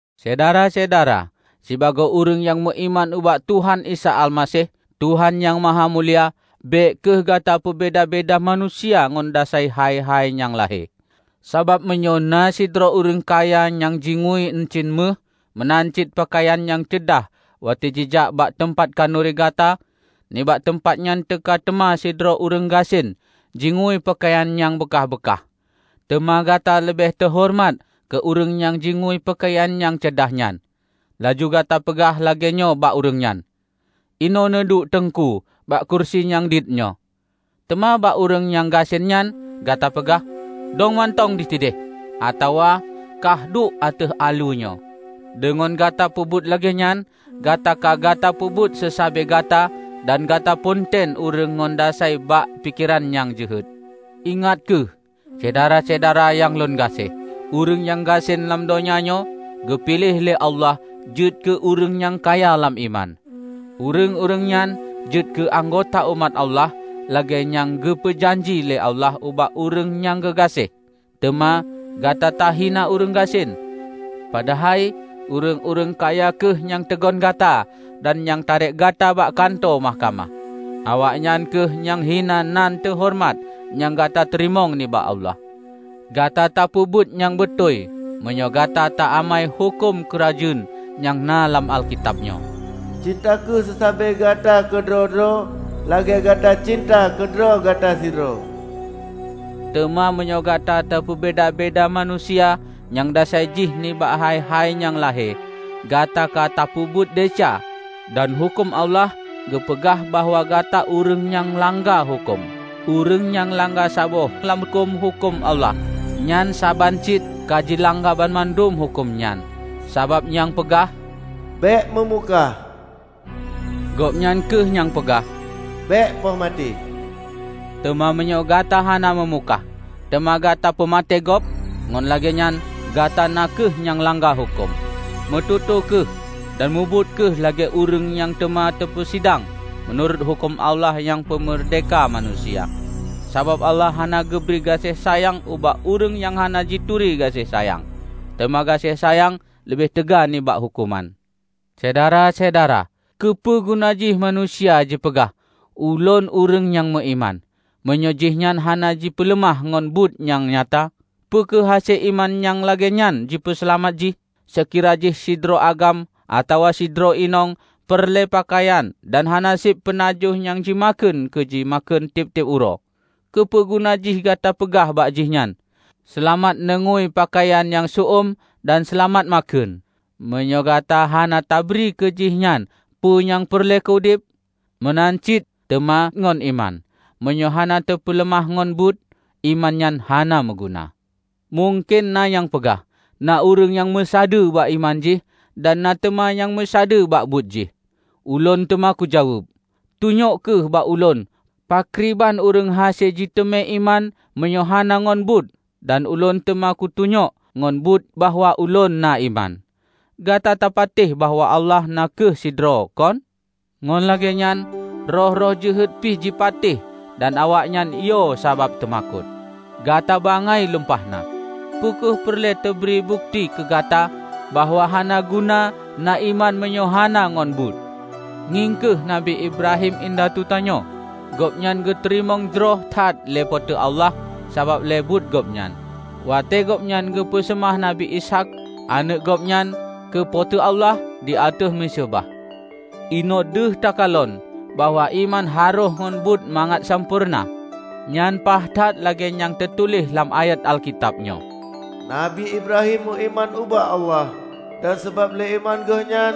Syedara-syedara! Sibagoe ureuëng nyang meuiman ubak Tuhan Isa Almaseh, Tuhan Nyang Mahamulia, bék kheueh gata peubeda-beda manusia ngon dasai hai-hai nyang lahé. Sabab meunyoe na sidroe ureuëng kaya nyang jingui euncien méuh meunan cit peukayan nyang ceudah watée jijak bak teumpat khanuri gata, nibak teumpat nyan teuka teuma sidroe ureuëng gasien jingui peukayan nyang beukah-beukah, teuma gata leubeh tahoreumat keu ureuëng nyang jingui peukayan ceudah nyan. Laju gata peugah lagée nyoe bak ureuëng nyan, "Inoe neuduek Teungku bak keurusi nyang diet nyoe." Teuma bak ureuëng nyang gasien nyan gata peugah, "Dong mantong disideh," atawa, "Kah duek ateueh aleue nyoe." Deungon gata peubuet lagée nyan, gata ka gata peubeda seusabe gata dan gata ponten ureuëng ngon dasai bak pikeran nyang jeuhet. Ingat kheueh, Syedara-syedara nyang lôn gaséh! Ureuëng nyang gasien lam donya nyoe, geupiléh lé Allah jeuet keu ureuëng nyang kaya lam iman. Ureuëng-ureuëng nyan jeuet keu anggota umat Allah lagée nyang geupeu janji lé Allah ubak ureuëng nyang geugaséh. Teuma gata tahina ureuëng gasien, padahai ureuëng-ureuëng kaya kheueh nyang teugon gata dan nyang tarek gata bak kantô mahkamah! Awaknyan kheueh nyang hina nan teuhoreumat nyang gata teurimong nibak Allah! Gata tapeubuet nyang beutôi, meunyoe gata ta amai huköm Keurajeuen nyang na lam Alkitab nyoe, "Cinta kheueh seusabe gata keudroe-droe lagée gata cinta keudroe gata sidroe." Teuma meunyoe gata tapeubeda-beda manusia nyang dasai jih nibak hai-hai nyang lahé, gata ka tapeubuet desya, dan huköm Allah geupeugah bahwa gata ureuëng nyang langga huköm. Ureuëng nyang langga saboh lam huköm-huköm Allah, nyan saban cit ka jilangga banmandum huköm nyan. Sabab nyang peugah, "Bék meumukah," gobnyan kheueh nyang peugah, "Bék poh maté." Teuma, meunyoe gata hana meumukah, teuma gata peumaté gob, ngon lagée nyan gata na kheueh nyang langga huköm. Meututoe kheueh dan mubuet kheueh lagée ureuëng nyang teuma teupeusidang meunurot huköm Allah nyang peumeurdehka manusia. Sabab Allah hana geubri gaséh sayang ubak ureuëng nyang hana jituri gaséh sayang. Teuma gaséh sayang leubeh teuga nibak huköman! Syedara-syedara! Keupeue guna jih manusia jipeugah, "Ulôn ureuëng nyang meuiman", meunyoe jihnyan hana jipeuleumah ngon buet nyang nyata? Peu kheueh hase iman nyang lagée nyan jipeuseulamat jih? Seukira jih sidroe agam atawa sidroe inong peureulée peukayan dan hana seb peunajoh nyang jimakheun keu jimakheun tieb-tieb uroe. Keupeue guna jih gata peugah bak jihnyan, "Seulamat neungui peukayan nyang seu-uem dan seulamat makheun!" -- meunyoe gata hana tabri keu jih nyan peue nyang peureulée keu udeb? Meunan cit teuma ngon iman, meunyoe hana teupeuleumah ngon buet, iman nyan hana meuguna. Mungken na nyang peugah, "Na ureuëng nyang meusadeue bak iman jih dan na teuma nyang meusadeue bak buet jih." Ulôn teuma kujaweueb, "Tunyok kheueh bak ulôn pakriban ureuëng hase jiteumé iman meunyoe hana ngon buet dan ulôn teuma kutunyok ngon buet bahwa ulôn na iman." Gata tapatéh bahwa Allah na kheueh sidroe, kon? Ngon lagée nyan, roh-roh jeuhet pi jipatéh dan awaknyan yo sabab teumakot! Gata bangai lumpah na! Peu kheueh peureulée teubri bukeuti keu gata bahwa hana guna na iman meunyoe hana ngon buet? Ngieng kheueh Nabi Ibrahim indatu tanyoe. Gobnyan geuteurimong jroh that lé Po teu Allah sabab lé buet gobnyan, watée gobnyan geupeu seumah Nabi Ishaq, aneuëk gobnyan, keu Po teu Allah di ateueh miseubah. Inoe deuh takalon bahwa iman harôh ngon buet mangat meusampoereuna. Nyan paih that lagée nyang teutuléh lam ayat Alkitab nyoe, "Nabi Ibrahim meuiman ubak Allah, dan sabab lé iman geuh nyan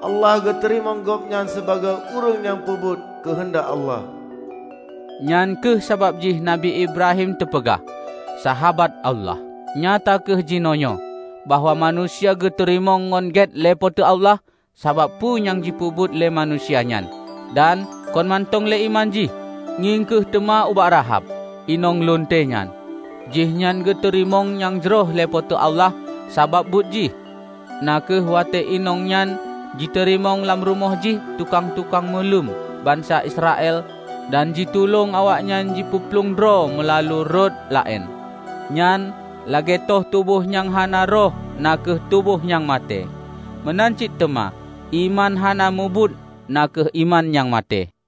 Allah geuteurimong gobnyan sibagoe ureuëng nyang peubuet keuheundak Allah." Nyang kheueh sabab jih Nabi Ibrahim teupeugah, "Sahabat Allah". Nyata kheueh jinoenyoe, bahwa manusia geuteurimong ngon gét lé Po teu Allah sabab peue nyang jipeubuet lé manusia nyan, dan kon mantong lé iman jih. Ngieng kheueh teuma ubak Rahab, inong lunte nyan. Jih nyan geuteurimong nyang jroh lé Po teu Allah sabab buet jih, na kheueh watée inong nyan jiteurimong lam rumoh jih tukang-tukang meuluem bansa Israel dan jitulông awaknyan jipeuplueng droe meulalu rot laén. Nyan, lagée toh tuboh nyang hana roh na kheueh tuboh nyang maté, meunan cit teuma iman hana mubuet na kheueh iman nyang maté.